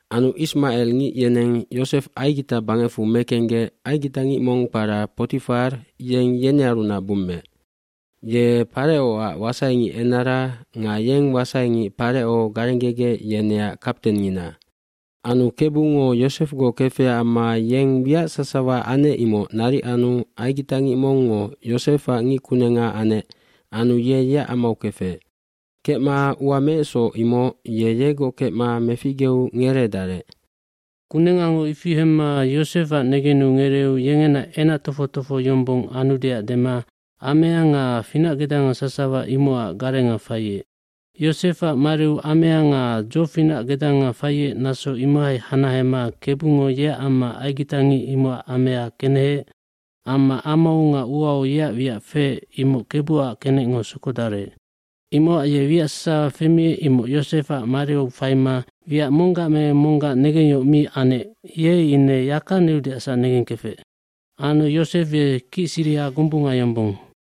aAnu ismacelngic yeneng Yosef Aigita bangecfu mekenggec aigitangic mong kpara Potifar yeng yenearunac bummeec. Ye Parecoac wasaingicenara nga yeng wasaingic Pareco garenggegec yeneac kaptengngina. bAnu Kebungo Yosefgoc kefecac amma yeng wiac sasawa anec imoc naric anu aigitangic mongngo Yosefac ngickunenga anec anu ye yeac amau kefec. cKecma ua meecsoc imoc ye yegoc kecma meficgeu ngereedarec. Kunengango ifi hemma Yosefac negenu ngereeu yengena enac tofoc tofoho yombong anudeac dema amea nga finacgedanga sasawa imocac garenga faiec. dYosefac mariu amea nga dzofinacgedanga faiec naso imohai hanahema Kebungo yeac amma aigitangic imocac amea keneheec amma amau nga uau yeac wiac feec imoc Kebuac kenecngo sokodarec. Imocac ye wiac sasawa femiec imoc Yosefac mariu faima wiac monggac me monggac negengyohoc mi anec ye ine yaka neudeacsac negengkefec. Anu Yosef ye kicsiriha gombunga yombong.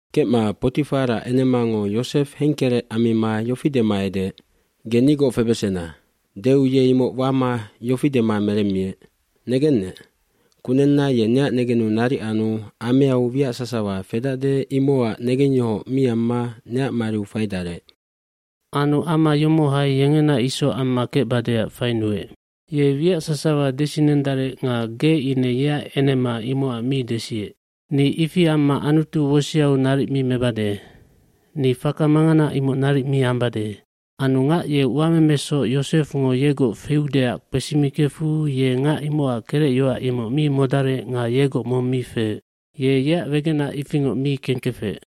Kecma Potifarac enemango Yosef hengkerec ammima yofi dema edeec, “Ge nigoc febesena.” Deu ye imoc wama yofi dema meremmiec, “Negennec, kunenna ye neac negenu naric anu ameau wiac sasawa fedacde imocac negengyohoc mi amma neac mariu faidarec. Anu ama yomohai yengena isoc amma kecbadeac fainuec. Ye wiac sasawa desinendarec nga ge ine yeac enema imocac mi desiec. Ni ifi amma Anutu woseau naric mi mebade. Ni faka mangana imoc naric mi ambade.” Anu ngac ye uamemesoc Yosefngo yegoc feudeac kpesimikefu ye ngac imocac kerecyoac imoc mi modarec nga yegoc mong mi feec. Ye yeac wegenac ifingoc mi kengkefec.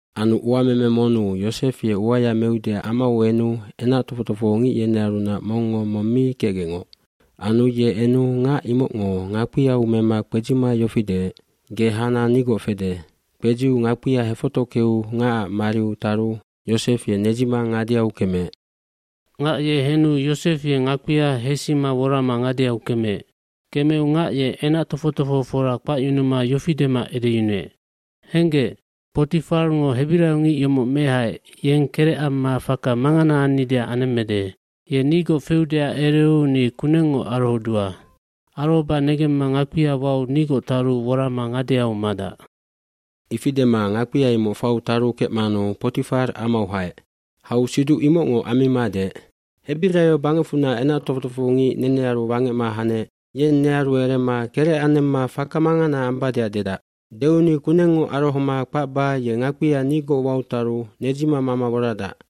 Anu uameme monnu Yosef ye uaya meudeac amau enu enac tofoc tofohongic yenearunac mongngo mong mi kecgecngoc. Anu ye enu ngac imocngo ngakpiau mema kpedzima yofi deec, “Ge hana nigoc fede.” Kpedziu ngakpia hefotockeu ngacac mariu taru Yosef ye nedzima ngadeau kemeec. Ngac ye henu Yosef ye ngakpia hesima worama ngadeau kemeec. Kemeu ngac ye enac tofoc tofohofora kpacyunuma yofi dema edeyunuec, “Henggec, Potifarngo hebiraiongic yomoc mehaec yeng kerec amma faka mangana annideac anemmede. Ye nigoc feudeac ereu ni kunengngoc arohodua. Arohoba negemma ngakpia wau nigoc taru worama ngadeau madac.” Ifi dema ngakpia imoc fau taru kecmanu Potifar amau haec. Hau siduc imocngoc ammima deec, “Hebiraio bangecfunac enac tofoc tofohongic nenearu wangecma hanec yeng nearu erema kerec anemma faka mangana ambadeac dedac. Deu ni kunengngoc arohoma kpacba ye ngakpia nigoc wau taru nedzima mama woradac.”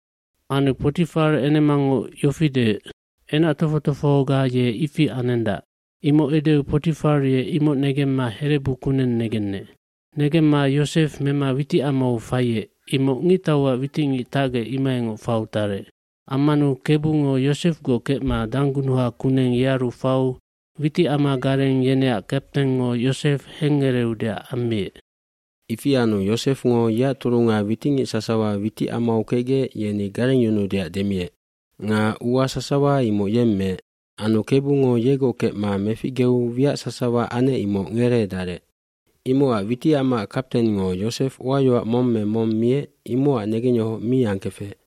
Anu Potifar enemango yofi deec, “Enac tofoc tofohoga ye ifi anendac.” imoc edeu Potifar ye imoc negemma herebu kuneng negenec. Negemma Yosef mema witicamau faiec imoc ngictauac witicngic tacgec imohaingoc fau tarec. eAmmanu Kebungo Yosefgoc kecma danggunuha kuneng yearu fau witicamagarengyeneac kaptengngo Yosef hengngereudeac ammiec. Ifi anu Yosefngo yeac turunga witicngic sasawa witicamau kecgec yenigarengyunuudeac demiec. Nga ua sasawa imoc yeng meec. Anu Kebungo yegoc kecma meficgeu wiac sasawa anec imoc ngereedarec. Imocac witicamaac kaptengngo Yosef uayoac mong me mong miecimocac negengyohoc mi angkefec.